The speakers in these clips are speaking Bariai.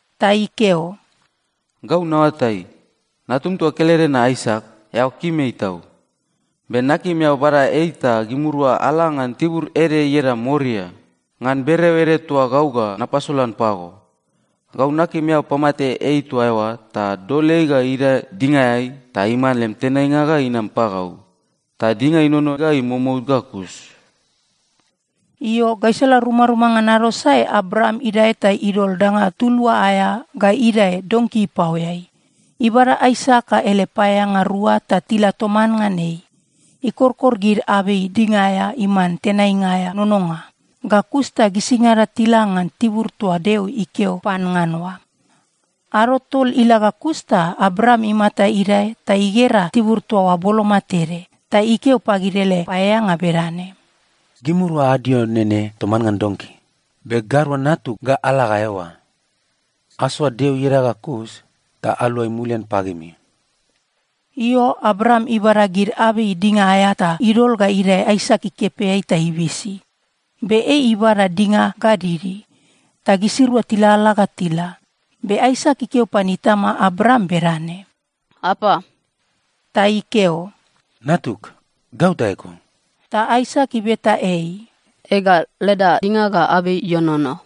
Ta ikeo, “Gau naoatai, natum toa kelede na Aisak, eao kim ei tau. Be nakim eao bada ei ta gimirua ala ngan tibur ede ieda Moria, ngan bereo ede toa gau ga napasolan pago. Gau nakim eao pamate ei toa eoa ta dol ei ga idae dingaeai ta iman lem tenainga ga inam pagau, ta dinga inono ga imomout ga kus.” Io, gaisala rumaruma ngan ado sae Abraam idae ta idol danga tulua aea ga idae donki ipaoeai. Ibada Aisak ga ele paeaeanga rua ta tila toman ngan ei. Ikorkor gid abei dinga aea iman tenainga aea nononga, ga kus ta gisingada tila ngan tibur toa Deo ikeo pan ngan oa. Ado tol ila ga kus ta Abraam imata idae ta igera tibur toa oa boloma tede. Ta ikeo pagid ele paeaeanga bedane, “Gimirua adio nene toman ngan donki, be gairua natug ga ala ga eoa. Asoa Deo ieda ga kus ta aluagai mulian pagimi.” Io, Abraam ibada gid abei dinga aea ta idol ga idae Aisak ikepeai ta ibisi. Be ei ibada dinga ga didi. Ta gisirua tilalala ga tila. Be Aisak ikeo pan itama Abraam bedane, “Apa?” Ta ikeo, “Natug, gau ta eko.” Ta Aisak ibeta ei, “Ega, leda dinga ga abei ienono,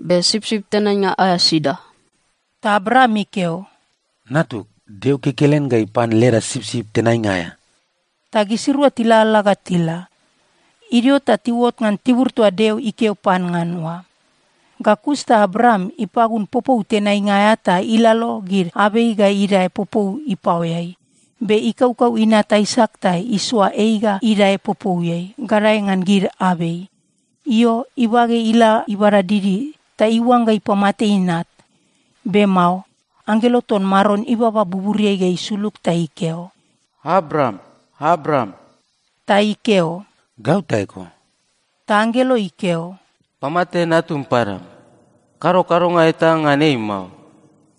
be sipsip tenainga aea sida?” Ta Abraam ikeo, “Natug, Deo kekelen ga ipan leda sipsip tenainga aea.” Ta gisirua tilalala ga tila. Idio ta tiuot ngan tibur toa Deo ikeo pan ngan oa. Ga kus ta Abraam ipagun popou tenainga aea ta ilalo gid abei ga idae popou ipaoeai. Be ikaukau inat Aisak ta isoa ei ga idae popouiai, gadae ngan gid abei. Io, ibage ila ibada didi, ta iuangga ipamate inat. Be mao. Anggelo ton Maron ibaba buburiai ga isulug ta ikeo, “Abraam, Abraam!” Ta ikeo, “Gau ta eko.” Ta anggelo ikeo, “Pamate natum padam. Kado kadonga eta ngan ei mao.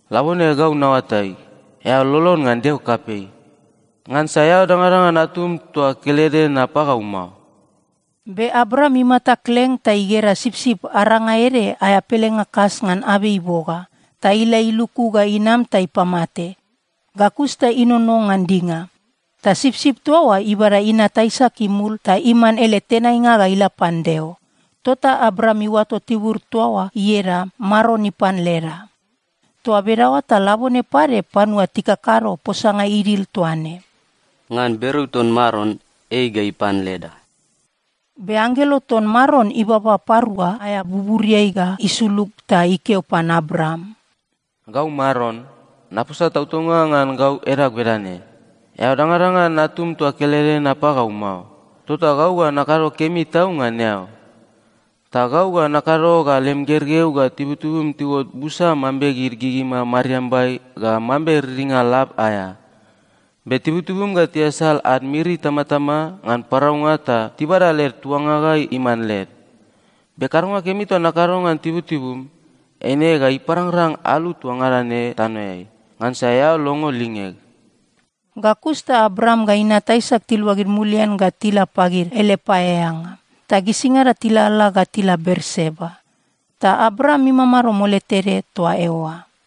Labone gau naoatai, eao lolon ngan Deo kapei. Ngansa eao dangadangan natum toa kelede na pagau mao.” Be Abraam imata kleng ta igera sipsip aranga ede aea pelenga kas ngan abei iboga. Ta ila iluku ga inam ta ipamate. Ga kus ta inono ngan dinga. Ta sipsip toa oa ibada inat Aisak imul ta iman ele tenainga ga ila pan Deo. Tota Abraam iuato tibur toa oa ieda “Maron ipan leda.” Toa bedaoa ta labone pade panua tikakado posanga idil toa ne, “Ngan bereo ton Maron, ei ga ipan leda.” Be anggelo ton Maron ibaba parua aea buburiai ga isulug ta ikeo pan Abraam, “Gau Maron, naposa tautaunga ngan gau edag bedane: Eao dangadangan natum toa kelede na pagau mao, tota gau ga nakado kemi tau ngan eao. Ta gau ga nakado ga lem gergeu ga tibutibum tiuot busa mambe gid gigima mariambai ga mambe riringa lab aea. Be tibutibum ga tiasal ad miri itamatama ngan paraunga ta tibada led tuanga ga iman led. Be kadonga kemi toa nakado ngan tibutibum, eine ga iparangrang alu toa ngada ne tanoeai, ngansa eao longo lingeg.” Ga kus ta Abraam ga inat Aisak tiluagid mulian ga tila pagid ele paeaeanga. Ta gisingada tilalala ga tila Berseba. Ta Abraam imamado mole tede toa eoa.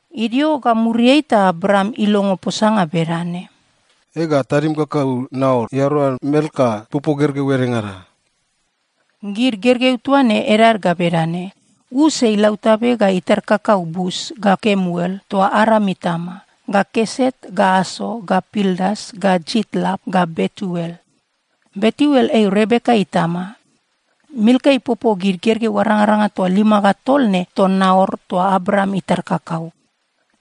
Idio ga muriai ta Abraam ilongo posanga bedane, “Ega, tadim kakau Naor iadaoa Milka ipopo gergeu edengada.” Gid gergeu toa ne edad ga bedane: Us ei lautabe ga itar kakau Bus ga Kemuel, toa Aram itama, ga Keset ga Aso ga Pildas ga Jitlap ga Betuel. Betuel ei Rebeka itama. Milka ipopo gid gergeu arangaranga toa lima ga tol ne ton Naor toa Abraam itar kakau.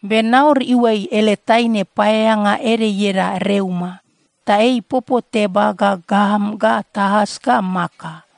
Be Naor iuai ele taine paeaeanga ede ieda Reuma. Ta ei ipopo Teba ga Gaam ga Taas ga Maka.